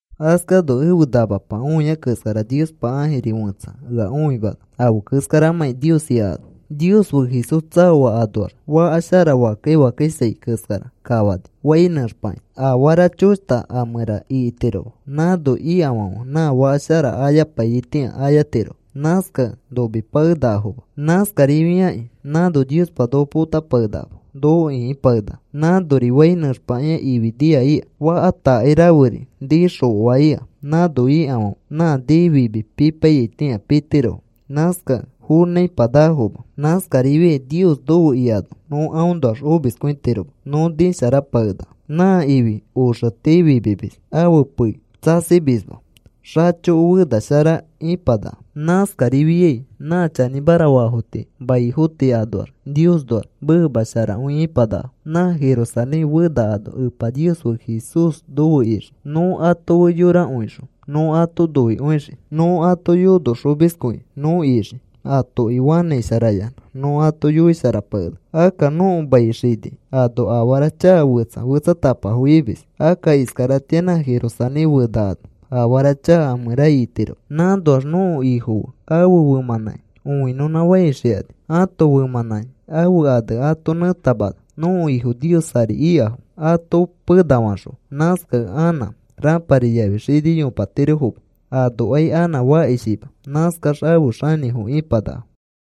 Askano ẽfe namapa õiai keskara Niospa ãjiri fẽtsa ea õimana afe keskaramãki Nios ika ano. Nios fe Jesús tsaoa anoax faka shara fakkai fakkaisai keskara kafani, fai nẽxpakĩa. Afara choshta a mẽra ikitiroma. Nãno ikafãfe nã faka shara ayapaiyaitĩa ayatirofo, nãskakẽ nomipakenakafoma. (Nãskarifiakĩ nãno Niospa noko potapakenakama noko ĩkipakenaka.) Nãnori fai nẽxpakĩa ifi nia ika. Faka takai raferi nii xokoa ika. Nãno ikafãfe nã nii fimi pipaiyaitĩa pitirofo. Nãskakẽ fonãipanakafoma. Nãskarifiai Nios nofe ikano nõ aõnoax omiskõitiroma nõ nisharapakenaka. Nã ifi oxe tii fimimis. Ãfe pei tsasimisma xachoko fena shara ipanaka. Nãskarifiai nã chanĩmara faafo tii maifo tii anoax Niosnoax meema sharakõi ipanakafo. Nã Jerusalén Fena ano Epa Nios fe Jesús nofe ixii. Nõ ato fe yorakõixõ nõ ato noikõixii. Nõ ãto yonoxomiskõi nõ ixii. Atoki fanãisharayanã nõ ato yoisharapakenaka. Akka nõko mai xini ano afara chaka fetsa fetsatapafo imis. Akka iskaratĩa nã Jerusalén Fena ano afara chaka a mẽra itiroma. Nãnoax nõko Ifo fe ãfe femãnãki õinõnãfafãixikani. Ãto femãnãki ãfe ane ato nẽtamana. Nõko Ifo Nios ari ikafo ato penafaxõa. Nãskakẽ anã rãpari yafi xini yopatirofoma. Anokai anã fakishima. Nãskax afe xanĩfo ipanakafo.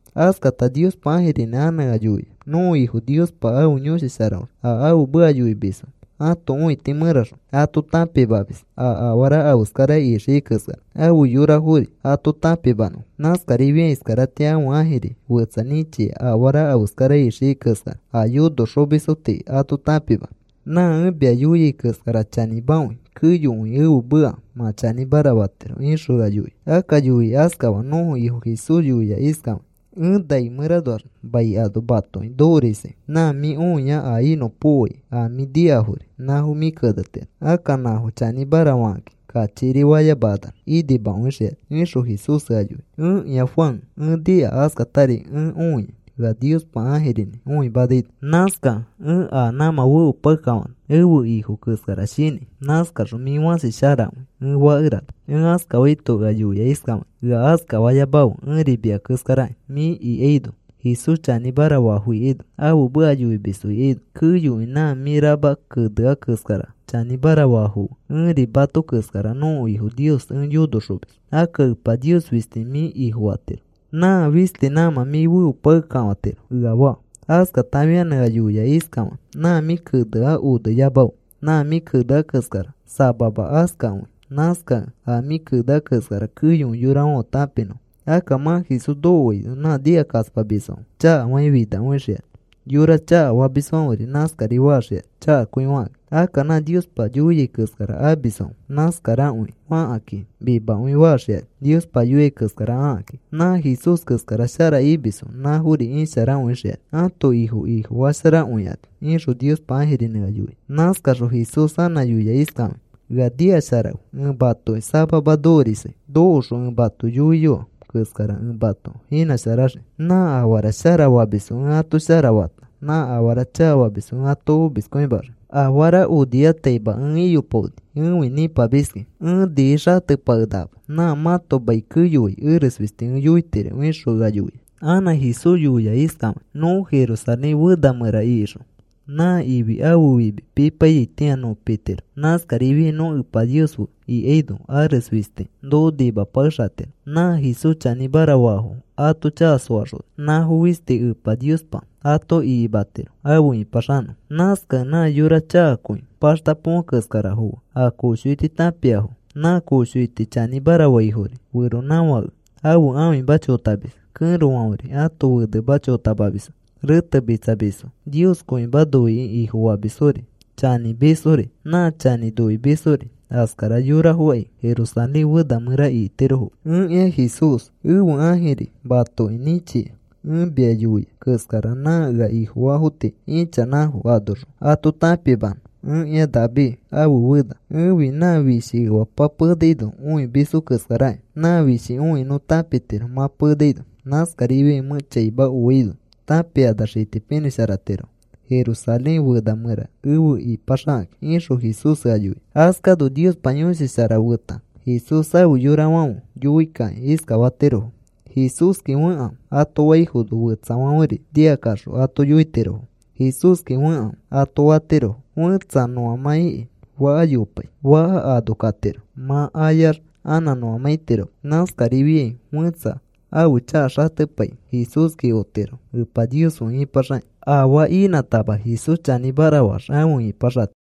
Askata Niospa ãjirinĩ anã ea yoia: “Nõko Ifo Niospa ãfe Yõshi Sharaõxõ a ãfe meka yoimisfo ãto õiti mẽraxõ ato tãpimamis a afara afeskara ixiai keskara afe yorafori ato tãpimanõfo. Nãskarifiakĩ iskaratĩa ãfe ãjiri fetsa nĩchia afara afeskara ixiai keskara a yonoxomisfo tii ato tãpimanõ. Nã ẽ mia yoiai keskara chanĩmakõi. Keyokõi ẽfe meka mã chanĩmara fatiro,” ixõ ea yoia. Akka yoikĩ iskafaa nõko Ifo Jesús yoia iskafakĩ: “Ẽ nai mẽranoax mai ano matoki nokorisai. Nã mĩ õia a inõpokoai a mĩ nikafori, nãfo mĩ kenetiro. Akka nãfo chanĩmara fakakĩ kachikiri fayamakanax inimakõixikani,” ixõ Jesús ea yoia. Ẽkĩa Juan ẽ nika, askatari ẽ õia ea Niospa ãjirinĩ õimanaino. Nãskakẽ ẽ a nãmã feopakekafana ẽfe Ifo keskara shinãi. Nãskaxõ, “Mĩ fãsi sharakõi,” ẽ fakerana. Ẽ askafaito ea yoia iskafakĩ: “Ea askafayamafe. Ẽri mia keskaraki. Mĩ ikaino, Jesús chanĩmara faafo ikaino, ãfe meka yoimisfo ikaino, keyokõi nã mĩ rama kenea keskara chanĩmara faafo fe, ẽri mato keskara nõko Ifo Nios ẽ yonoxomis. Akka Epa Nios fisti mĩ Ifofatiro. Nã fisti nãmã mĩ feopakekafatiro,” ea faa. Askata afianã ea yoia iskafakĩ: “Nã mĩ kenea oneyamafe. Nã mĩ kenea keskara samama askakõi. Nãskakẽ a mĩ kenea keskara keyokõi yorafãfe tãpinõfo. Akka mã Jesús nokoaino nã nikakaspamisfãfe chakafakĩ finakõixikani. Yora chakafamisfãferi nãskari faxikani chakakõi fakakĩ. Akka nã Niospa yoiai keskara amisfãfe nãskarakõi fakakĩ mimakõi faxikani Niospa yoiai keskara akakĩ. Nã Jesús keskara shara imisfo nãfori isharakõixikani ãto Ifo ifosharakõifakani,” ixõ Niospa ãjirinĩ ea yoia. Nãskaxõ Jesús anã yoia iskafakĩ: “Ea nikasharakãfe. Ẽ matoki samama nokorisai. Nokoxõ ẽ mato yoiyoa keskara ẽ mato inãsharaxii. Nã afara shara famisfo ẽ ato shara fata nã afara chakafamisfo ẽ ato omiskõimaxii. Afarafo onifataima ẽ iyopaoni. Ẽfi nĩpamiskĩ. Ẽ niixatepakenakama. Nã mãto mai keyoai eres fisti ẽ yoitiro,” ixõ ea yoia. Anã Jesús yoia iskafakĩ: “Nõ Jerusalén Fena mẽra ikixõ, nã ifi ãfe fimi pipaiyaitĩa nõ pitiro. Nãskarifiai nõ Epa Nios fe ikaino ares fisti noko nimapakexatiro. Nã Jesús chanĩmara faafo ato chaka soaxona nãfo fisti Epa Niospa ato ikimatiro afe ĩpaxanõfo. Nãskakẽ nã yora chakakõi paxta põfe keskarafo fe, a koshoiti tãpiafo, nã koshoiti chanĩmara faifori, feronãfãke ãfe ãfima chotamis, kẽrofãferi ãto fenema chotamamisfo, retemitsamisfori, Nioskõima noikĩ ifofamisfori, chanĩmisfori, nã chanĩ noimisfori, askara yorafokai Jerusalén Fena mẽra ikitirofoma. “Ẽkĩa Jesús, ẽfe ãjiri matoki nĩchia ẽ mia yoia keskara nã ea Ifofaafo tii ichanãfo anoxõ ato tãpimanõ. Ẽkĩa David ãfe fena. Ẽfi nã fishi efapa penaino õimisfo keskarakĩ. Nã fishi õikĩ nõ tãpitiro mã penaino. Nãskarifiai mẽ chaima oaino tãpikanax itipinĩsharatirofo Jerusalén Fena mẽra efe ipaxakakĩ,” ixõ Jesús ea yoia. Askano Niospa Yõshi Shara feta Jesús afe yorafãferi yoikakĩ iskafatirofo: “Jesúski fekãfe,” ato faifono, fetsafãferi nikakaxõ ato yoitirofo: “Jesúski fekãfe,” ato fatirofo. Fẽtsa nõamã ikĩ faka yopai, faka ano katiro mã ayax anã nõamã itiroma. Nãskarifiai fẽtsa ãfe chaka xatepai, Jesúski otiro Epa Nios fe ipaxakĩ. Afaa inãtama Jesús chanĩmara faax, afe ipaxatiro.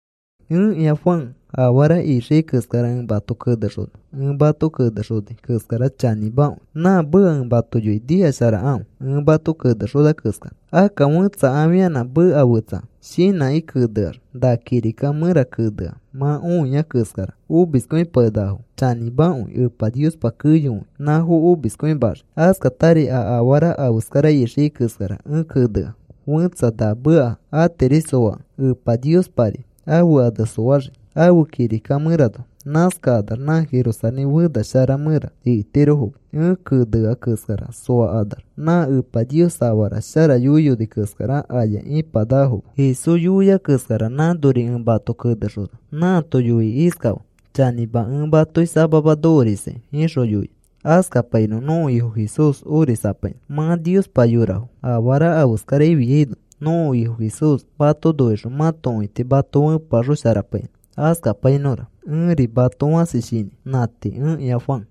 Ẽkĩa Juan, afara ixiai keskara ẽ mato kenexona. Ẽ mato kenexonai keskara chanĩmakõi. Nã meka ẽ mato yoiai nikasharakãfe. Ẽ mato kenexona keskara akka fẽtsa afianã meka fetsa shinãkĩ keneax, na kirika mẽra kenea mã õiai keskara omiskõipakenakafo chanĩmakõi Epa Niospa keyokõi nãfo omiskõimaxii. Askatari a afara afeskara ixiai keskara ẽ kenea fẽtsa na meka atiri soakẽ Epa Niospari ãfe ane soaxii ãfe kirika mẽranoa. Nãskakanax nã Jerusalén Fena shara mẽra ikitirofoma. Ẽ kenea keskara soakanax nã Epa Nios afara shara yoiyoni keskara, aya ipanakafoma. Jesús yoia keskara nãnori ẽ mato kenexona. Nãato yoikĩ iskafaa: “Chanĩma, ẽ matoki samama nokorisai,” ixõ yoia. Askapainõ. Nõko Ifo Jesús orisapainõ. Mã Niospa yorafo. Afara afeskara afiaino nõko Ifo Jesús mato noixõ mãto õiti mato fẽpeaxosharapainõ. Askapainõra. Ẽri mato fãsi shinãi. Nã tii. Ẽkĩa Juan